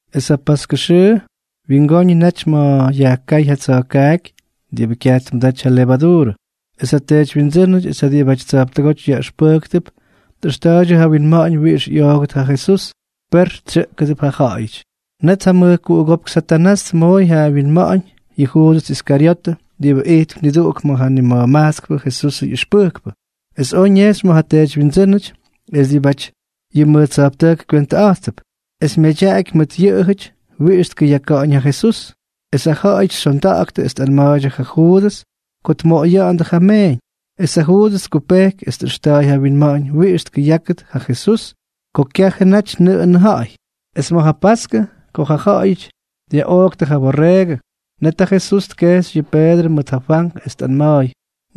Es ja paskʉ wyingoñʉ naty ma̱ yajkáy ja tsa̱jkaaky diꞌibʉ kyaj tmʉdaty ja levaduurʉ. Es ja teedywyindsʉ́nʉty es ja diꞌibʉty tsa̱jptʉgóty yaꞌʉxpʉjktʉp tꞌʉxta̱ꞌa̱ydyʉ ja winma̱ꞌa̱ñ wiꞌix ꞌyoogʉt ja Jesús, per ttsʉꞌʉgʉdʉ ja ja̱ꞌa̱yʉty. Net ja mʉjkuꞌugópk Satanás tmooy ja winma̱ꞌa̱ñ yʉ Juudʉs Iskaryotʉ diꞌibʉ ijtp niduꞌuk ma̱ ja nima̱jmajtskpʉ Jesusʉ ꞌyʉxpʉjkpʉ, es oj ñejxy ma̱ ja teedywyindsʉ́nʉty es diꞌibʉty yʉ mʉj tsa̱jptʉjk kywentʉꞌa̱jttʉp, es myadyaky mʉt yʉꞌʉjʉty wiꞌix tkʉyaka̱ꞌa̱ñ ja Jesús. Es ja ja̱ꞌa̱yʉty xyondaktʉ es tꞌanma̱a̱ydyʉ ja Juudʉs ko tmoꞌoya̱ꞌa̱ndʉ ja meeñ. Es ja Juudʉs tkupejky es tꞌʉxta̱a̱y ja winma̱ꞌa̱ñ wiꞌix tkʉyákʉt ja Jesús ko kyajʉ naty nʉꞌʉnʉ ja̱ꞌa̱y. Es ma̱ ja paskʉ ko ja ja̱ꞌa̱yʉty dyaꞌooktʉ ja byorreegʉ, net ja Jesús tkejxy yʉ Peedrʉ mʉt ja Fwank es tꞌanma̱a̱y: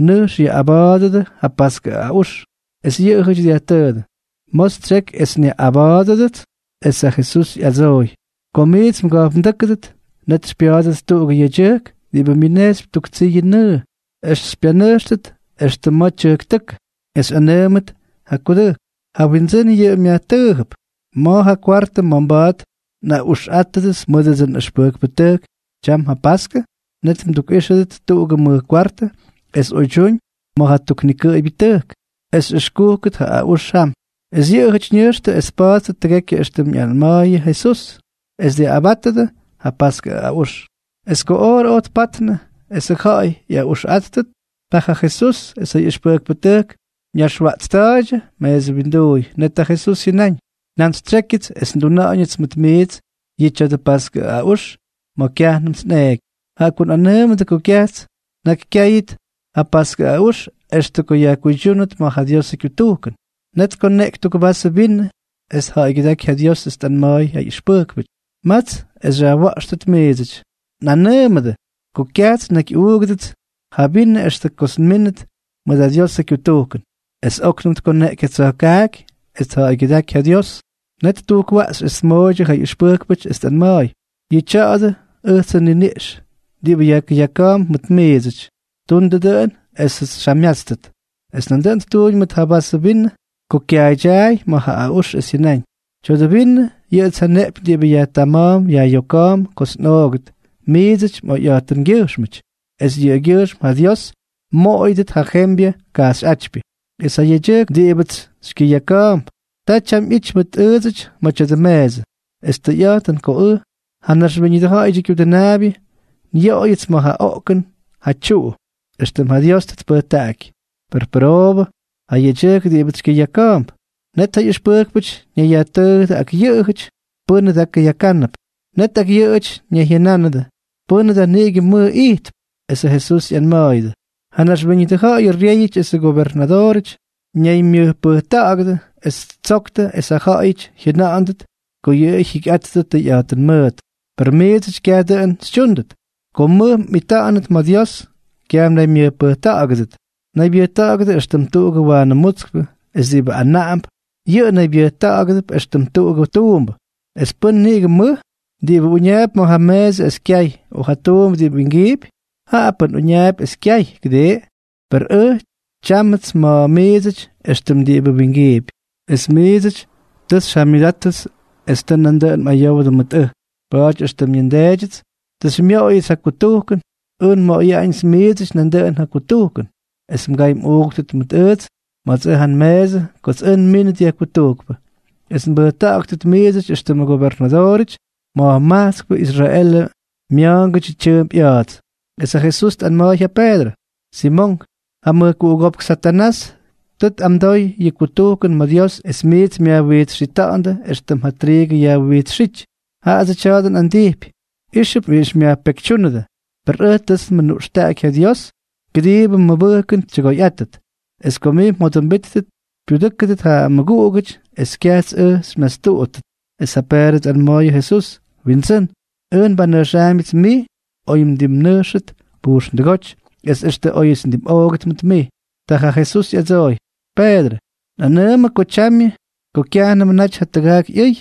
—Nʉjx yaꞌꞌaba̱a̱dʉdʉ ja paskʉ aꞌux. Es yʉꞌʉjʉty dyajtʉʉdʉ: —¿Ma̱ xytsyeky es nyaꞌꞌaba̱a̱dʉdʉts? Es ja Jesús ꞌyadsooy: —Ko miits mga̱jpndʉ́kʉdʉt, net xypya̱a̱dʉt tuꞌugʉ yedyʉjk diꞌibʉ myʉnejxypy tuk tsiyʉ nʉʉ, es xypyanʉjxʉt extʉ ma̱ tyʉjktʉ́kʉ. Es xyꞌanʉʉmʉt ja kudʉjk: “Ja Windsʉ́n yʉꞌʉ myajtʉʉjʉp: ¿Ma̱ ja kwartʉ ma̱ mba̱a̱t nꞌaꞌuxꞌáttʉdʉts mʉdʉdsʉ nꞌʉxpʉjkpʉtʉjk tyam ja paskʉ?” Net mdukꞌíxʉdʉt tuꞌugʉ mʉj kwartʉ es oydyúñ ma̱ ja tuknikʉꞌʉybyʉ tʉjk. Es xyꞌʉxkúkʉt ja aꞌux jam. Es yʉꞌʉjʉty ñʉjxtʉ es tpattʉ tʉgekyʉ éxtʉm ꞌyanma̱a̱yʉ ja Jesús, es dyaꞌꞌabátʉdʉ ja paskʉ aꞌux. Es ko oorʉ oj tpatnʉ esʉ ja̱ꞌa̱y ꞌyꞌaꞌuxꞌáttʉt, ta ja Jesús es ja ꞌyʉxpʉjkpʉtʉjk ñaxwaꞌtsta̱a̱ydyʉ meesʉ winduuy. Net ja Jesús jyʉnáñ: —Njantsytsyékyʉts es nduna̱ꞌa̱ñʉts mʉt miits yʉ tya̱dʉ paskʉ aꞌux ma̱ kyajnʉmts nꞌeeky. Jaꞌa ko nꞌanʉʉmʉdʉ ko kyajts nnakykyáyʉt ja paskʉ aꞌux extʉ ko yajkuydyúnʉt ma̱ ja Diosʉ kyutujkʉn. Net tkoneꞌky tuk vasʉ vinʉ es tja̱ꞌa̱ygyʉdáky ja Dios es tꞌanma̱a̱y ja ꞌyʉxpʉjkpʉty: —Matstʉ es xyajwa̱ꞌxtʉt miidsʉty. Nꞌanʉʉmʉdʉ ko kyajts nnakyꞌuugʉdʉts ja vinʉ extʉ ko myínʉt ja Diosʉ kyutujkʉn. Es óknʉm tkoneꞌky ja tsa̱jkaaky es tja̱ꞌa̱ygyʉdáky ja Dios, net ttujkwaꞌxy es tmooydyʉ ja ꞌyʉxpʉjkpʉty es tꞌanma̱a̱y: —Yʉꞌʉ tya̱a̱dʉ ʉjtsʉ nniniꞌx diꞌibʉ yajkʉyaka̱a̱mp mʉt miidsʉty. Tundʉ dʉꞌʉn esʉts xyjamyátstʉt. Es nandʉꞌʉn ttuuñ mʉt ja vasʉ vinʉ ko kyaaydyaay ma̱ ja aꞌux es jyʉnáñ: —Tya̱dʉ vinʉ, yʉꞌʉts ja nneꞌpyñ diꞌibʉ yajtama̱a̱mp yajꞌyoka̱a̱mp kots nꞌoogʉt miidsʉty mꞌoyꞌa̱jtʉngyʉjxmʉty es yʉꞌʉgyʉjxm ja Dios mmoꞌoyʉdʉt ja jembyʉ kajxyꞌátypyʉ. ’Es ja yedyʉjk diꞌibʉts xykyʉyaka̱a̱mp, ta tyam ꞌyity mʉt ʉʉdsʉty ma̱ tya̱dʉ meesʉ. Es tʉyꞌa̱jtʉn ko ʉj, ja Naxwíñʉdʉ Ja̱ꞌa̱yʉdyʉ Kyudʉnaabyʉ, nyoꞌoyʉts ma̱ ja oꞌkʉn ja tyuꞌu, éxtʉm ja Dios tʉ tpʉjtaꞌaky. Per pʉroobʉ ja yedyʉjk diꞌibʉts xykyʉyaka̱a̱mp. Net ja ꞌyʉxpʉjkpʉty ñayyajtʉʉjʉdʉ ak yʉꞌʉjʉty pʉ́nʉ da kʉyakánʉp. Net ak yʉꞌʉjʉty ñayjyʉnánʉdʉ pʉ́nʉ da niꞌigʉ mʉj ijtp. Es ja Jesús ꞌyanma̱a̱yʉdʉ: —Ja naxwíñʉdʉ ja̱ꞌa̱yʉ ryéyʉty esʉ gyobernadoorʉty ñaymyʉjpʉjta̱ꞌa̱gʉdʉ, es ttsoktʉ es ja ja̱ꞌa̱yʉty jyʉna̱ꞌa̱ndʉt ko yʉꞌʉ jyikyꞌattʉ tʉyꞌa̱jtʉn mʉʉt. Per miidsʉty kyaj dʉꞌʉn xytyúndʉt. Ko mʉj mꞌita̱ꞌa̱nʉt ma̱ Dios, kyaj mnaymyʉjpʉjta̱ꞌa̱gʉdʉt. Naybyʉjta̱ꞌa̱gʉdʉ éxtʉm diꞌibʉ waanʉ mutskpʉ, es diꞌibʉ anaꞌamp, yʉꞌʉ naybyʉjtákʉp éxtʉm tuꞌugʉ tuumbʉ. ¿Es pʉ́n niꞌigʉ mʉj? ¿Diꞌibʉ uñaapy ma̱ ja meesʉ es kyay, o ja tuumbʉ diꞌibʉ wingiipy? Jaꞌa pʉ́n uñaapy es kyay, ¿kʉdii? Per ʉj tyámʉts ma̱ miidsʉty éxtʉm diꞌibʉ wingiipy. ’Es miidsʉty tʉ xyjamyʉdáttʉts es tʉ nandʉꞌʉn mꞌayowdʉ mʉt ʉj. Pa̱a̱ty éxtʉm yʉ nDeedyʉts tʉ xymyoꞌoyʉts ja kutujkʉn, ʉj nmoꞌoyaꞌañʉts miidsʉty nandʉꞌʉn ja kutujkʉn es mgay mꞌuuktʉt mʉt ʉjts ma̱ts ja nmeesʉ kots ʉj nmínʉt yajkutujkpʉ, es nbʉjta̱ꞌa̱ktʉt miidsʉty éxtʉmʉ gobernadoorʉty es mꞌanaꞌamʉt ma̱ ja ma̱jmajtskpʉ Israelʉ mya̱a̱ngʉdyʉ tyʉʉmp ꞌya̱a̱ts. Es ja Jesús tꞌanma̱a̱y ja Peedrʉ: —Simonk, ja mʉjkuꞌugópk Satanás tʉ tꞌamdoy yʉ kutujkʉn ma̱ Dios es miits myajwijtsxita̱ꞌa̱ndʉ éxtʉm ja triigʉ yajwinxíty. Jaꞌadsʉ tya̱a̱dʉ nꞌandijpy, íxʉp wiꞌix myajpekytyúnʉdʉ. Per ʉj tʉts nmʉnuꞌxtaꞌaky ja Dios kʉdiibʉ mmʉbʉjkʉn tyʉgoyꞌátʉt. Es ko mij mjodʉmbítʉt, xypyudʉ́kʉt ja mmʉguꞌugʉty es kyajts ʉj xymyastuꞌuttʉt. Es ja Peedrʉ tꞌanma̱a̱y ja Jesús: —Windsʉ́n, ʉj nbanʉjxaambyʉts mij oy mdimnʉjxʉt pujxndʉgóty, es extʉ óyʉts ndimꞌoogʉt mʉt mij. Ta ja Jesús ꞌyadsooy: —Peedrʉ, nꞌanʉʉmʉ ko tyamyʉ, ko kyajnʉmʉ naty ja tʉgaak ꞌyʉy,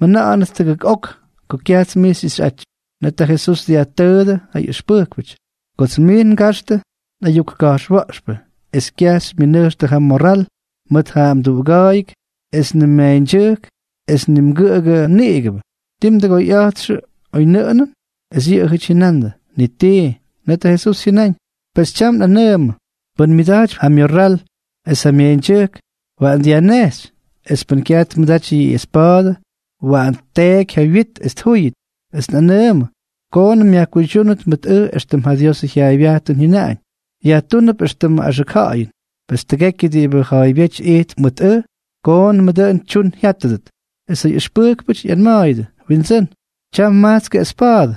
mjʉna̱ꞌa̱nʉt tʉgʉk ok ko kyajts mij xyꞌixyꞌaty. Net ja Jesús dyajtʉʉdʉ ja ꞌyʉxpʉjkpʉty: —Kots mij ngajxtʉ nꞌayuk ka̱jxwa̱ꞌxpʉ es kyaj xymyʉnʉjxtʉ ja mmorral mʉt ja mduꞌuga̱a̱yʉk es ni mmeeñdyʉjk es ni mgʉꞌʉgʉ niꞌigʉbʉ, ¿tii mdʉgoyꞌa̱jtxʉ oynʉꞌʉnʉn? Es yʉꞌʉjʉty jyʉnandʉ: —Ni tii. Net ja Jesús jyʉnáñ: —Pes tyam nꞌanʉʉmʉ, pʉ́n myʉda̱jtypy ja myorral es ja myeeñdyʉjk, waꞌan dyajnejxy. Es pʉ́n kyaj tmʉdaty yʉ espa̱a̱dʉ, waꞌan tteeky ja wyit es tjúyʉt. Es nꞌanʉʉmʉ koonʉm yajkuydyúnʉt mʉt ʉj éxtʉm ja Diosʉ jyaaybyajtʉn jyʉnaꞌañ: “Yajtúnʉp éxtʉmʉ axʉk ja̱ꞌa̱yʉn.” Pes, tʉgekyʉ diꞌibʉ ja̱a̱ybyéty ijtp mʉt ʉj, koonʉmʉ dʉꞌʉn tyuñ jyátʉdʉt. Es ja ꞌyʉxpʉjkpʉty ꞌyanma̱a̱yʉdʉ: —Windsʉ́n, tyam majtskʉ espa̱a̱dʉ.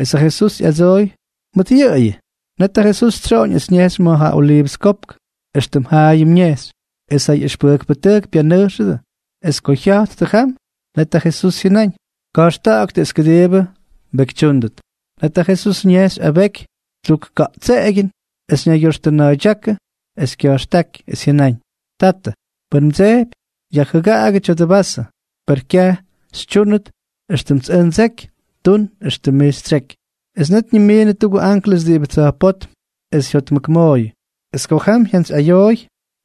Es ja Jesús ꞌyadsooy: —Mʉt yʉꞌʉyʉ. Net ja Jesús tsyoꞌoñ es ñejxy ma̱ ja Oliivʉs Kopk, éxtʉm jaayʉm ñejxy. Es ja ꞌyʉxpʉjkpʉtʉjk pyanʉjxʉdʉ. Es ko jya̱jttʉ jam, net ja Jesús jyʉnáñ: —Ka̱jxta̱ꞌa̱ktʉ es kʉdiibʉ mbekytyúndʉt. Net ja Jesús ñejxy abeky tuk ka̱ꞌtskeꞌegyʉn, es ñaygyoxtʉna̱a̱ydyákʉ es kya̱jxtáky, es jyʉnáñ: —Tatʉ, pʉn mdsejpy, yajjʉgaꞌagʉ tya̱dʉ vasʉ. Per kyaj tyúnʉt éxtʉmts ʉj ndseky, tun éxtʉm mij xytsyeky. Es net ñimiinʉ tuꞌugʉ anklʉs diꞌibʉ tsa̱jpótm es jyotmʉkmooyʉ. Es ko jam jyantsyꞌayooy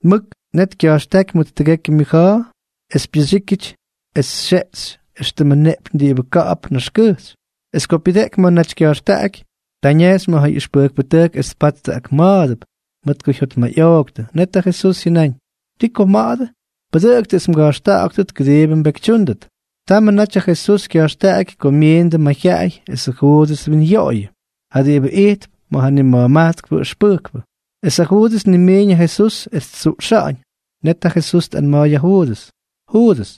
mʉk, net kya̱jxtáky mʉt tʉgekyʉ myʉja̱a̱, es pyʉxyíkyʉty es xyeꞌxy éxtʉmʉ neꞌpyñ diꞌibʉ ka̱ꞌa̱p naxkʉjxy. Es ko pyʉdeꞌky ma̱ naty kya̱jxtaꞌaky, ta ñejxy ma̱ ja ꞌyʉxpʉjkpʉtʉjk, es tpattʉ ak ma̱a̱dʉp, mʉt ko jyotmayꞌooktʉ. Net ja Jesús jyʉnáñ: —¿Ti ko mma̱ꞌa̱dʉ? Pʉdʉꞌʉktʉ es mga̱jxta̱ꞌa̱ktʉt, kʉdiibʉ mbekytyúndʉt. Támnʉmʉ naty ja Jesús ꞌyakkajxy ko myiindʉ mayjyaꞌay es ja Juudʉs twinyoꞌoyʉdʉ, ja diꞌibʉ ijtp ma̱ nima̱jmajtskpʉ ʉxpʉjkpʉ. Es ja Juudʉs tnimiiñ ja Jesús es ttsuꞌxa̱ꞌa̱ñ. Net ja Jesús tꞌanma̱a̱y ja Juudʉs: —Juudʉs,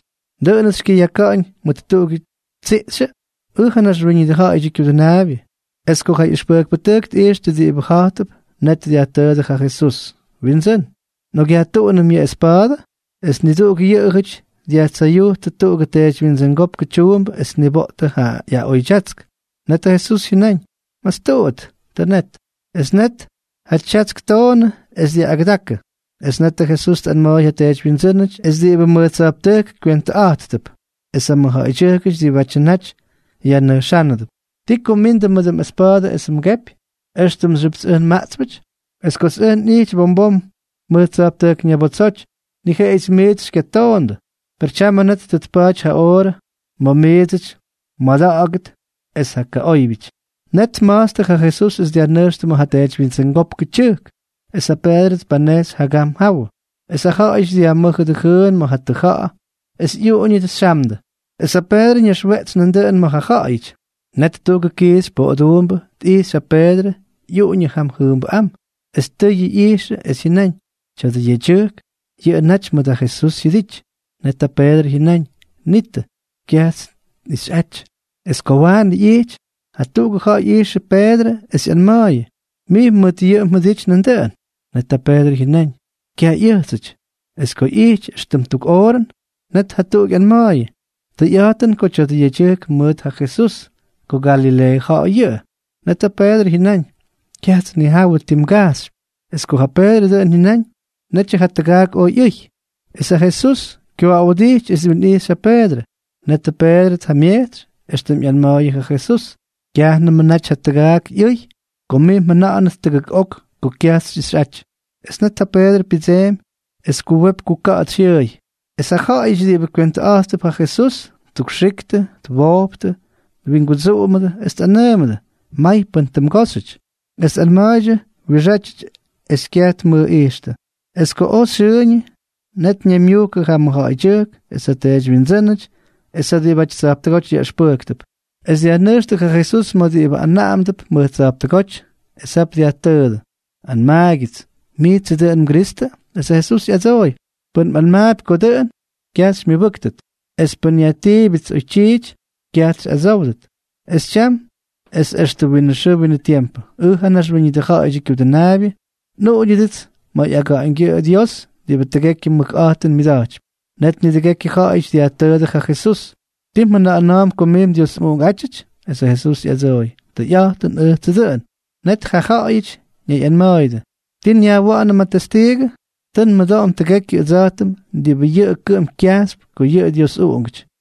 ¿dʉꞌʉnʉts xykyʉyaka̱ꞌa̱ñ mʉt tuꞌugʉ tsiꞌxyʉ?, ʉj, ja Naxwíñʉdʉ Ja̱ꞌa̱yʉdyʉ Kyudʉnaabyʉ. Es ko ja ꞌyʉxpʉjkpʉtʉjk tꞌixtʉ diꞌibʉ ja̱jtʉp, net dyajtʉʉdʉ ja Jesús: —Windsʉ́n, ¿nꞌokꞌyajtuꞌunʉm yʉ espa̱a̱dʉ? Es niduꞌuk yʉꞌʉjʉty dyajtsayujtʉ tuꞌugʉ teedywyindsʉngópkʉ tyuumbʉ es tniboꞌtʉ ja ꞌyaꞌoydyatsk. Net ja Jesús jyʉnáñ: —¡Mastuꞌut! ¡Tʉ net! Es net ja tyatsk ttoonʉ, es dyaꞌꞌagʉdakʉ. Es netʉ Jesús tꞌanma̱a̱y ja teedywyindsʉ́nʉty es diꞌibʉ mʉj tsa̱jptʉjk kywentʉꞌa̱jttʉp es ja mʉjja̱ꞌa̱ydyʉjkʉty diꞌibʉ naty yajnʉjxándʉp: —¿Ti ko mmindʉ mʉt ja espa̱a̱dʉ es ja kepy, éxtʉmxyʉpts ʉj nmaꞌtspʉty? Es kots ʉj nꞌijty bom bom mʉj tsa̱jptʉjk ñabotsoty, ni jeꞌeyʉts miits xykyatoondʉ. Per tyamʉ net tʉ tpa̱a̱ty ja oorʉ ma̱ miidsʉty mmada̱ꞌa̱gʉt es ja kaꞌóybyʉty. Net tma̱jtstʉ ja Jesús es dyajnʉjxtʉ ma̱ ja teedywyindsʉngópkʉ tyʉjk, es ja Peedrʉ tpanejxy jagam jawʉ. Es ja ja̱ꞌa̱yʉty dyajmʉ́jʉdʉ jʉʉn ma̱ ja tʉja̱ꞌa̱, es ꞌyuꞌuñʉdʉ xyamdʉ; es ja Peedrʉ ñaxweꞌtsy nandʉꞌʉn ma̱ ja ja̱ꞌa̱yʉty. Net tuꞌugʉ kiixy poꞌoduumbʉ tꞌijxy ja Peedrʉ ꞌyuꞌuñʉ jam jʉʉmbʉꞌám. Es tʉyʉ ꞌyijxʉ es jyʉnáñ: —Tya̱dʉ yedyʉjk, yʉꞌʉ naty mʉt ja Jesús jyʉdity. Net ja Peedrʉ jyʉnáñ: —Nitʉ, kyajts nꞌixyꞌaty. Es ko waanʉ ꞌyijty, jatuꞌugʉ ja̱ꞌa̱y ꞌyijxʉ ja Peedrʉ es ꞌyanma̱a̱yʉ: —Mij mʉt yʉꞌʉ mjʉdity nandʉꞌʉn. Net ja Peedrʉ jyʉnáñ: —Kyaj ꞌyʉjtsʉty. Es ko ꞌyijty éxtʉm tuk oorʉn, net jatuꞌuk ꞌyanma̱a̱yʉ: —Tʉyꞌa̱jtʉn ko tya̱dʉ yedyʉjk mʉt ja Jesús, ko Galileeʉ ja̱ꞌa̱y yʉꞌʉ. Net ja Peedrʉ jyʉnáñ: —Kyajts nnijawʉ ti mij mgajxypy. Es ko ja Peedrʉ dʉꞌʉn jyʉnáñ, netyʉ ja tʉgaak oj ꞌyʉy. Es ja Jesús kyooꞌawdijty es twinꞌijxy ja Peedrʉ. Net ja Peedrʉ tjamyejtsy éxtʉm ꞌyanma̱a̱yʉ ja Jesús: “Kyajnʉmʉ naty ja tʉgaak ꞌyʉy ko mij mjʉna̱ꞌa̱nʉt tʉgʉk ok ko kyajts xyꞌixyꞌaty.” Es net ja Peedrʉ pyʉdseemy es kuwepy kuka̱ꞌa̱tsy jyʉʉy. Es ja ja̱ꞌa̱yʉty diꞌibʉ kywentʉꞌa̱jttʉp ja Jesús ttukxiktʉ, twojptʉ, twingudsuꞌumʉdʉ, es tꞌanʉʉmʉdʉ: —May pʉ́n tʉ mgóxyʉty. Es tꞌanma̱a̱ydyʉ wiꞌixátyʉty es kyaj tmʉjꞌijxtʉ. Es ko oj xyʉʉñʉ, net ñaymyujkʉdʉ ja mʉjja̱ꞌa̱ydyʉjk es ja teedywyindsʉ́nʉty es ja diꞌibʉty tsa̱jptʉgóty yaꞌʉxpʉjktʉp, es dyajnʉjxtʉ ja Jesús ma̱ diꞌibʉ anaꞌamdʉp mʉj tsa̱jptʉgóty. Es jap dyajtʉʉdʉ: —Anmaagyʉts, ¿mijtsʉ dʉꞌʉn mGristʉ? Esʉ Jesús ꞌyadsooy: —Pʉn nꞌanmaapy ko dʉꞌʉn, kyaj xymyʉbʉ́ktʉt, es pʉn nyajtiibyʉts oytyiity, kyajts xyꞌadsówdʉt. Es tyam es extʉ winʉ xʉʉ winʉ tiempʉ, ʉj ja Naxwíñʉdʉ Ja̱ꞌa̱yʉdyʉ Kyudʉnaabyʉ, nꞌuꞌuñʉdʉts ma̱ ꞌyaga̱ꞌa̱ñgyʉꞌʉ Dios diꞌibʉ tʉgekyʉ mʉkꞌa̱jtʉn myʉda̱jtypy. Net nidʉgekyʉ jaꞌajʉty dyajtʉʉdʉ ja Jesús: —¿Tii mjʉna̱ꞌa̱na̱a̱mp ko mij Dios mꞌUꞌunkꞌátyʉty? Esʉ Jesús ꞌyadsooy: —Tʉyꞌa̱jtʉn, ʉjtsʉ dʉꞌʉn. Net ja ja̱ꞌa̱yʉty ñayꞌanma̱a̱yʉdʉ: —¿Ti nyajwa̱ꞌa̱nʉm ja testiigʉ? Tʉ nmʉdoꞌom tʉgekyʉ ʉdsa̱jtʉm diꞌibʉ yʉꞌʉ kʉꞌʉm kyajxypy ko yʉꞌʉ Dios ꞌyUꞌunkꞌátyʉty.